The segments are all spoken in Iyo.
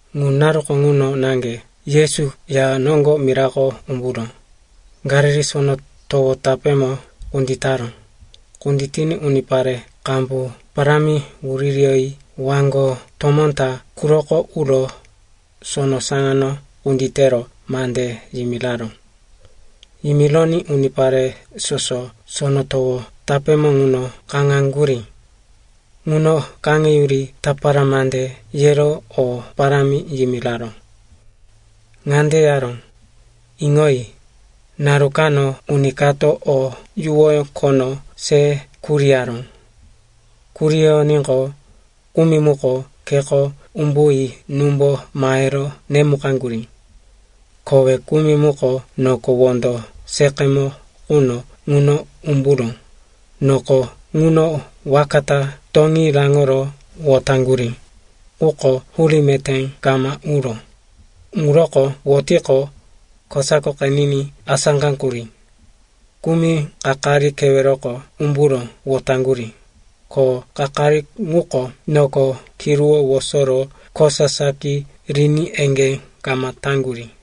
Ŋu naruko ŋuno naŋge Yesu ya noŋgo mirako umburo Galili Sono Towo tapémo kunditaró. Kunditiní unipare qambu parámi wuririyoyi waŋgo tomó ta quroko uro sono saŋano kunditero mande yimiraró. Yimironí unipare soso sono towo tapémo ŋuno kaŋaŋgurí. Ŋuno kaŋeyuri tapara mande yero o parámi yimiraró. Ŋande yaró, “Iŋoyi, naru kano uni kato o yuwoyó khono se kuriyaró. Kuriyoníqo, kumi muko kheko umbuyi númbo mahero nemukaŋgurí. Kowe kumi muko noko wondo seqemo quno ŋuno umburo noko ŋuno waka ta toŋí raŋoro wotaŋgurí. Quko hurí meté kama uró. Ŋuroko wotiqo, kosako qeniní asáqaŋgurí. Kumi kakari keweroko umburo wotaŋgurí, ko kakari muko noko kiruwó wosoro kosa saki riní eŋgé kama taŋgurí.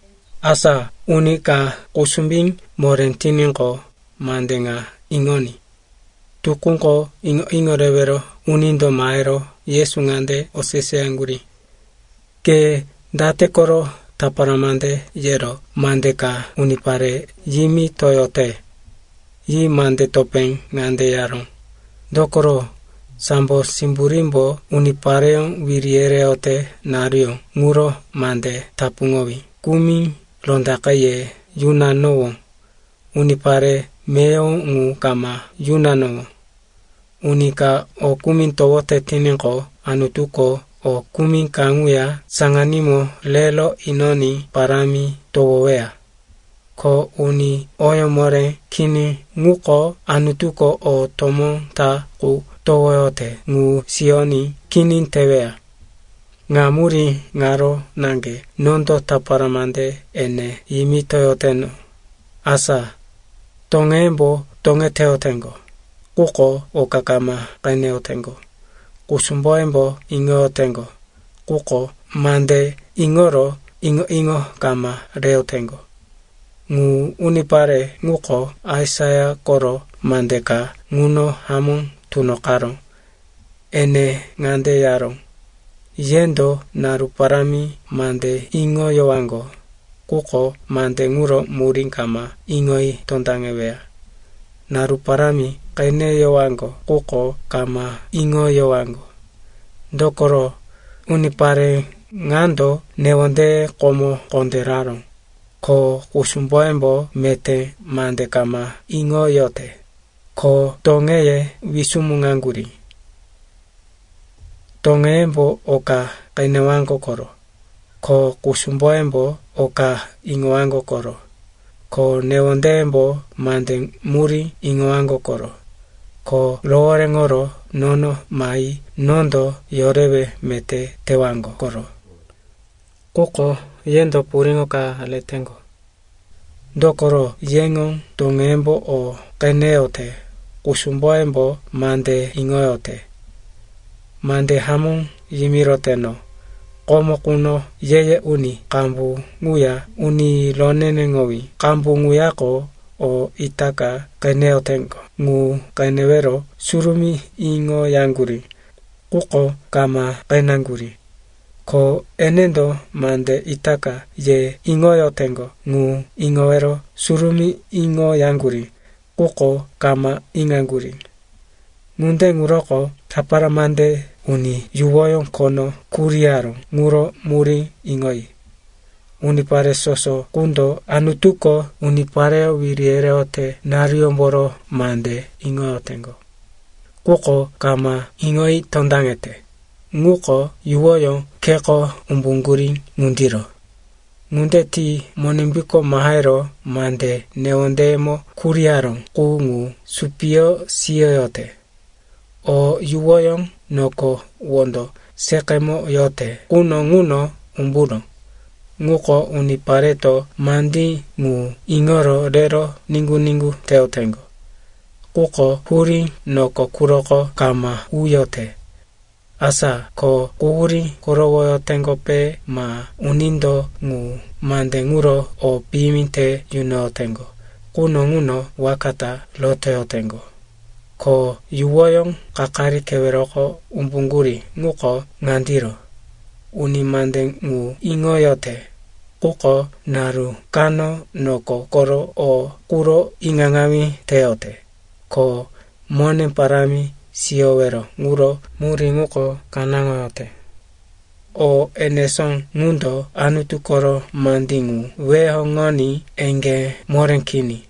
Asa uni ka kusumbí moré tiníqo, mande ŋa iŋoní.” Tukúko iŋo-iŋo rewero unindo mahero Yesu ŋande oseseyaŋgurí, “Ke date koro tapara mande yero mande ka unipare yimitoyote?” Yi mande topé ŋande yaró, “Dokoro sambo simburímbo unipareyó wiri yereyote naruyó ŋuro mande tapuŋowí kumi rondaqe ye yunanowó, unipare meyowo ŋu kama yunanowó. Uni ka o kumi towote tiníqo, Anutuko o kumi kaŋuya saŋanímo rero inoní parámi towoweya. Ko uni oyó moré kini ŋuko, Anutuko o tomó ta qu towoyote ŋu siyoní kini teweya. Ŋa murí ŋaro naŋge nondo tapara mande ene yimitoyoteno, asa “toŋeyembo toŋeteyoteŋgo, quko oka kama qeneyoteŋgo. Kusumboyembo iŋoyoteŋgo, quko mande iŋoro iŋo-iŋo kama reyoteŋgo. Ŋu unipare ŋuko, Aisaia koro mande ka ŋuno hamó tunoqaró. Ene ŋande yaró, “‘Yendo naru parámi mande iŋoyowaŋgo, quko mande ŋuro murí kama iŋoyi tondaŋeweya. Naru parámi qeneyowaŋgo, quko kama iŋoyowaŋgo. Dokoro unipare ŋando newondeye komo kondéraró, ko kusumboyembo meté mande kama iŋoyote, ko toŋeye wisumuŋaŋgurí. Toŋeyembo oka qenewaŋgo koro, ko kusumboyembo oka iŋowaŋgo koro, ko newondeyembo mande murí iŋowaŋgo koro, ko rohoréŋoro nono mahi nondo yorewe meté tewaŋgo koro.’ Quko yendo puriŋo ka reteŋgo. Dokoro yeŋo toŋeyembo o qeneyote, kusumboyembo mande iŋoyote. Mande hamó yimiroteno, komo quno ye-ye uni qambu ŋuya uni roneneŋowí qambu ŋuyako o itaka qeneyoteŋgo ŋu qenewero surumí iŋoyaŋgurí, quko kama qeneŋgurí. Ko enendo mande itaka ye iŋoyoteŋgo ŋu iŋowero surumí iŋoyaŋgurí, quko kama iŋaŋgurí. “Ŋunde ŋuroko tapara mande uni yuwoyó khono kuriyaró ŋuro murí iŋoyi. Unipare soso qundo Anutuko unipareyó wiri yereyote naruyómboro mande iŋoyoteŋgo, quko kama iŋoyi tondaŋete, ŋuko yuwoyó kheko umbuŋgurí ŋundiro. Ŋunde ti Monimbuko mahero mande newondeyemo kuriyaró qu ŋu supiyo siyoyote. O yuwoyó noko wondo seqemo yote quno ŋuno umburó, ŋuko unipareto mandí ŋu iŋoro rero niŋgu-niŋgu teyoteŋgo. Quko hurí noko quroko kama uyote. Asa ko quhurí korowoyoteŋgope ma unindo ŋu mande ŋuro o piyimi te yunoyoteŋgo quno ŋuno waka ta rotoyoteŋgo. Ko yuwoyó kakari keweroko umbuŋgurí ŋuko ŋandiro: uni mande ŋu iŋoyote. Quko naru kano noko koro o quro iŋaŋawí teyote, ko mone parámi siyowero ŋuro murí ŋuko kanáŋoyote. O enesó ŋundo Anutu koro mande ŋu weheŋoní eŋgé moré kini.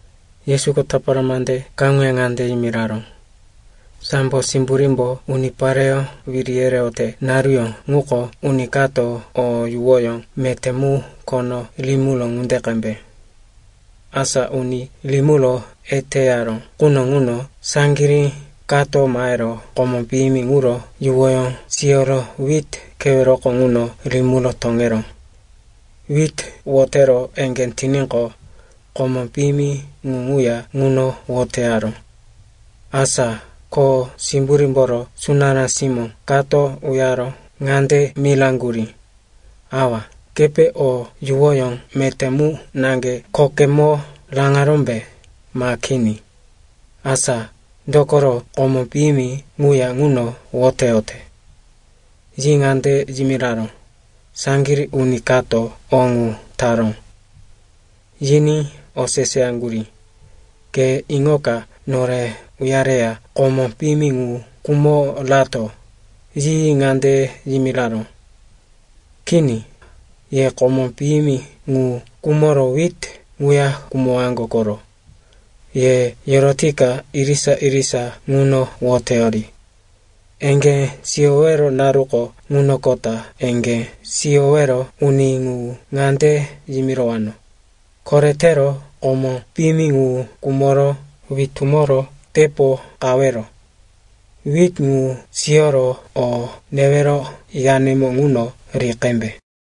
Yesuko tapara mande kaŋuya ŋande yimiraró, “Sambo simburímbo unipareyó wiri yereyote naruyó ŋuko uni kato o yuwoyó meté mu khono rimiró ŋunde qembe. Asa uni rimiro eteyaró quno ŋuno saŋgirí kato mahero komó piyimi ŋuro yuwoyó siyoro wit keweroko ŋuno rimiro toŋeró. Wit wotero eŋgé tiníqo, komó piyimi ŋu ŋuya ŋuno woteyaró. “Asa kho simburímboro sunará simó kato uyaro ŋande miraŋgurí, ‘Awa, kepe o yuwoyó meté mu naŋge khokemo raŋarómbe, ma kini? Asa dokoro komó piyimi ŋuya ŋuno woteyote?’ “Yi ŋande yimiraró, ‘Saŋgirí uni kato o ŋu taró.’ “Yiní oseseyaŋgurí, ‘Ke iŋoka nore uyareya komó piyimi ŋu kumo rato?’ “Yi ŋande yimiraró, ‘Kini, ye komó piyimi ŋu kumoro wit ŋuya kumowaŋgo koro. Ye rotoyika irisa-irisa ŋuno woteyori. Eŋgé siyowero naruko ŋunoqota eŋgé siyowero uni ŋu ŋande yimirowano, “Koretero komó piyimi ŋu kumoro witumoro tepo qawero. Wit ŋu siyoro o newero yanemo ŋuno ri qembe.”’”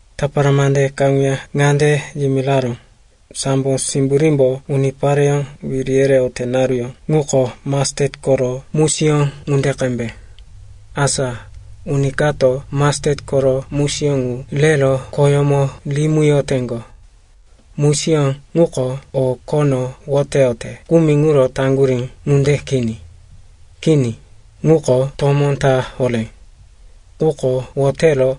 Tapara mande kaŋuya ŋande yimiraró, “Sambo simburímbo unipareyó wiri yereyote naruyó ŋuko mastet koro musiyó ŋunde qembe. Asa uni kato mastet koro musiyó ŋu rero khoyómo rimiyoteŋgo. Musiyó ŋuko o khono woteyote kumi ŋuro taŋgurí ŋunde kini. Kini, ŋuko tomó ta horé. Quko wotero,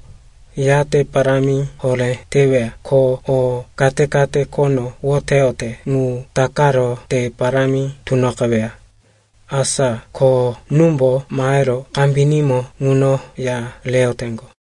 yate parámi horé teweya ko o kate-kate khono woteyote ŋu takaro te parámi tunoqeweya. Asa ko númbo mahero kambinímo ŋuno ya reyoteŋgo.”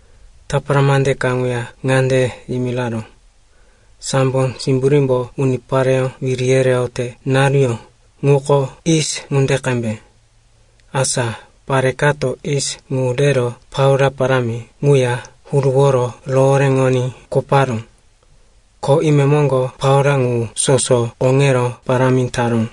Tapara mande kaŋuya ŋande yimiraró, “Sambo simburímbo unipareyó wiri yereyote naruyó ŋuko yis ŋunde qembe. Asa pare kato yis ŋu rero plaua parámi ŋuya huruworo rohoréŋoní koparó. Ko imemoŋgo plaua ŋu soso koŋero parámi taró.”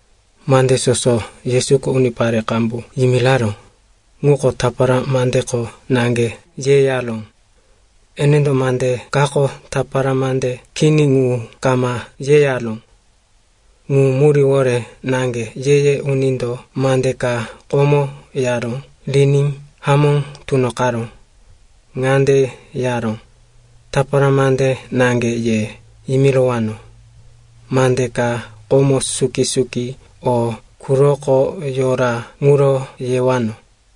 Mande soso Yesuko unipare qambu yimiraró ŋuko tapara mandeko naŋge yeyaró. Enendo mande kako tapara mande kini ŋu kama yeyaró. Ŋu muríwore naŋge ye-ye unindo mande ka komo yaró riní hamó tunoqaró. Ŋande yaró, “Tapara mande naŋge ye yimirowano, mande ka komo suki-suki o quroko yora ŋuro yewano.”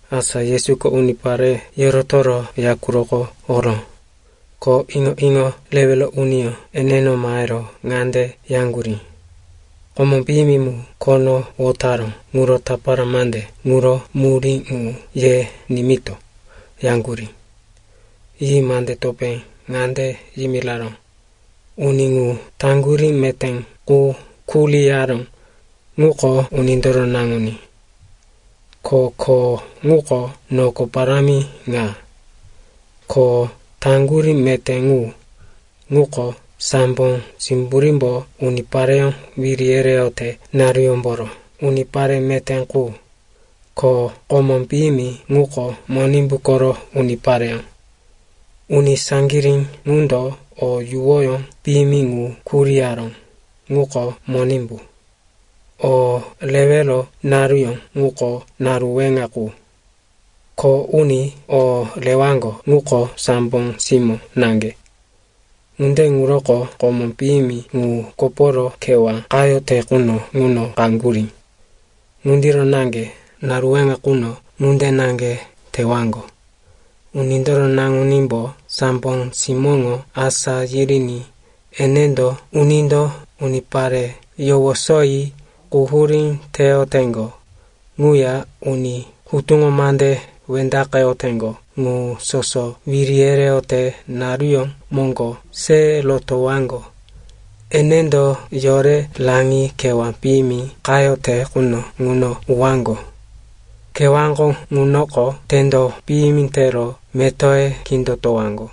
Asa Yesuko unipare yorotoro ya quroko oró. Ko iŋo-iŋo rewero uniyó eneno mahero ŋande yaŋgurí, “Komó piyimi mu khono wotaró ŋuro tapara mande ŋuro murí ŋu ye nimito,” yaŋgurí. Yi mande topé ŋande yimiraró, “Uni ŋu taŋgurí meté qu kuriyaró, ŋuko Unindoro Naŋuní. Ko kho ŋuko noko parámi ŋa. Ko taŋgurí meté ŋu, ŋuko sambo simburímbo unipareyó wiri yereyote naruyómboro unipare meté qu. Ko komó piyimi ŋuko Monimbu koro unipareyó. Uni saŋgirí ŋundo o yuwoyó piyimi ŋu kuriyaró, ŋuko Monimbu. O rewero naruyó ŋuko naru weŋa qu. Kho uni o rewaŋgo ŋuko sambo simó naŋge. “Ŋunde ŋuroko komó piyimi ŋu koporo kewá qayote quno ŋuno qaŋgurí, ŋundiro naŋge naru weŋa quno ŋunde naŋge tewaŋgo. Unindoro Naŋunímbo sambo simóŋo asá yiriní enendo unindo unipare yowosoyi quhurí teyoteŋgo ŋuya uni hutuŋo mande wendaqeyoteŋgo ŋu soso wiri yereyote naruyó moŋgo se rotowaŋgo. Enendo yore raŋi kewá piyimi qayote quno ŋuno uwaŋgo. Kewáko ŋunoko tendo piyimi tero metoye kindotowaŋgo.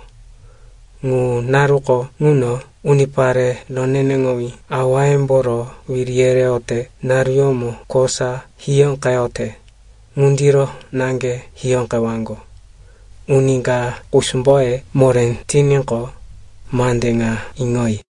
Ŋu naruko ŋuno unipare roneneŋowí awayemboro wiri yereyote naruyómo kosa hiyóqeyote ŋundiro naŋge hiyóqewaŋgo. Uni ka kusumboye moré tiníqo, mande ŋa iŋoyi.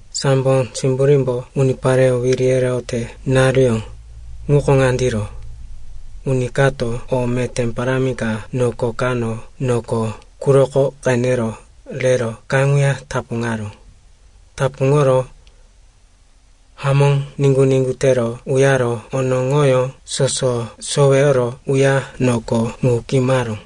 “Sambo simburímbo unipareyó wiri yereyote naruyó ŋuko ŋandiro. Uni kato o meté parámi ka noko kano noko quroko qenero rero kaŋuya tapuŋaró. Tapuŋoro hamó niŋgu-niŋgu tero uyaro onoŋoyó soso soweyoro uya noko ŋu kimaró.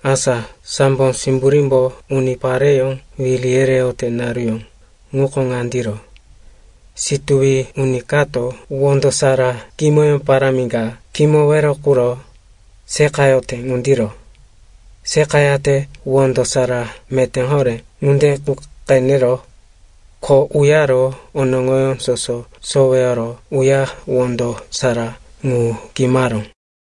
“Asa sambo simburímbo unipareyó wiri yereyote naruyó ŋuko ŋandiro. Situwi uni kato wondo sara kimoyó parámi ka kimowero quro seqayote ŋundiro. Seqayate wondo sara meté horé ŋunde qu qeneró, ko uyaro onoŋoyó soso soweyoro uya wondo sara ŋu kimaró.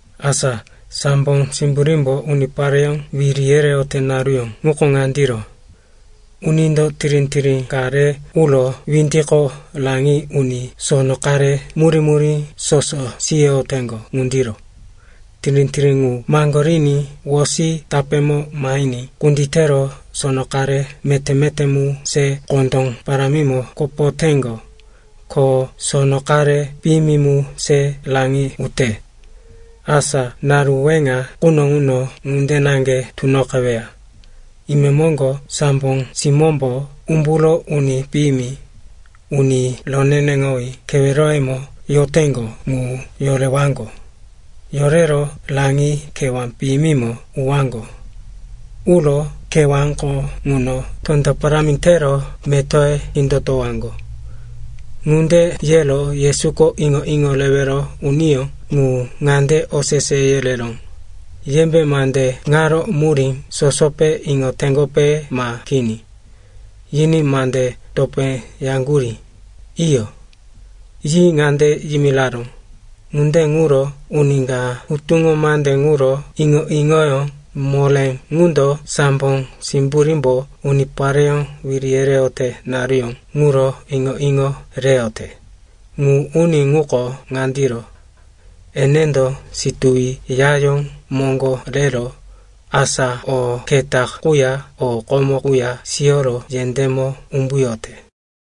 “Asa sambo simburímbo unipareyó wiri yereyote naruyó ŋuko ŋandiro. Unindo tirí-tirí ka re uro windiko raŋi uní sono qare murí-murí soso siyoyoteŋgo ŋundiro. Tirí-tirí ŋu maŋgoriní wosi tapémo mahiní kunditero sono qare meté-meté mu se kondó parámimo kopoteŋgo. Ko sono qare piyimi mu se raŋi ute. Asa naru weŋa quno ŋuno ŋunde naŋge tunoqeweya. Imemoŋgo sambo simómbo umburo uni piyimi, uni roneneŋowí keweroyemo yoteŋgo ŋu yorewaŋgo. Yorero raŋi kewá piyimimo uwaŋgo. Uro kewáko ŋuno tendo parámi tero metoye kindotowaŋgo.” Ŋunde yero Yesuko iŋo-iŋo rewero uniyó ŋu ŋande osese yereró, “Yembe mande ŋaro murí sosope iŋoteŋgope ma kini?” Yiní mande topé yaŋgurí, “Iyo.” Yi ŋande yimiraró, “Ŋunde ŋuro uni ka hutuŋo mande ŋuro iŋo-iŋoyó moré ŋundo sambo simburímbo unipareyó wiri yereyote naruyó ŋuro iŋo-iŋo reyote, ŋu uni ŋuko ŋandiro. Enendo situwi yayó moŋgo rero, asa o keta quya o komo quya siyoro yendémo umbuyote.”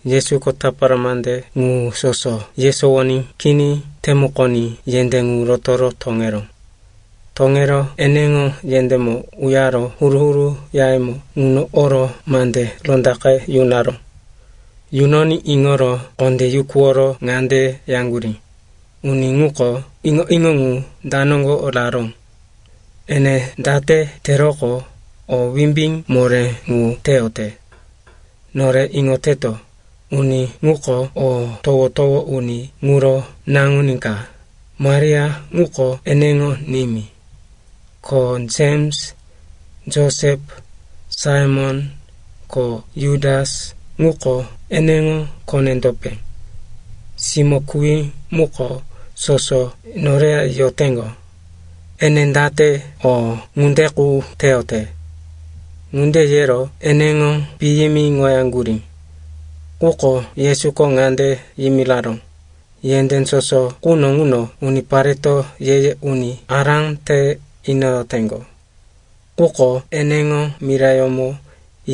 Yesuko tapara mande ŋu soso yesowoní kini temukoní yendé ŋu roto toŋeró. Toŋero eneŋo yendémo uyaro huru-huru yayemo ŋuno oro mande rondaqe yunaró. Yunoní iŋoro kondé yukuworo ŋande yaŋgurí, “Uni ŋuko iŋo-iŋo ŋu da noŋgo raró? Ene date teroqo, o wimbí moré ŋu teyote? Nore iŋoteto, uni ŋuko o towo-towo uni ŋuro naŋuní ka, Maria ŋuko eneŋo nimí. Ko Jems, Josep, Saimon ko Jutas ŋuko eneŋo kone-topé. Simó kuwí ŋuko, soso noreya yoteŋgo. Ene date o ŋunde qu teyote?” Ŋunde yero eneŋo piyimiŋoyaŋgurí. Quko Yesuko ŋande yimiraró, “Yendé soso quno ŋuno unipareto ye-ye uni ará te inoyoteŋgo. Quko eneŋo mirayómo,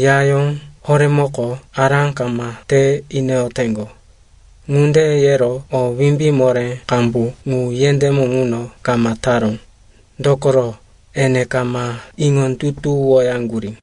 yayó horémoko ará kama te inoyoteŋgo.” Ŋunde yero o wimbí moré qambu ŋu yendémo ŋuno kama taró, dokoro, ene kama iŋondutuwoyaŋgurí.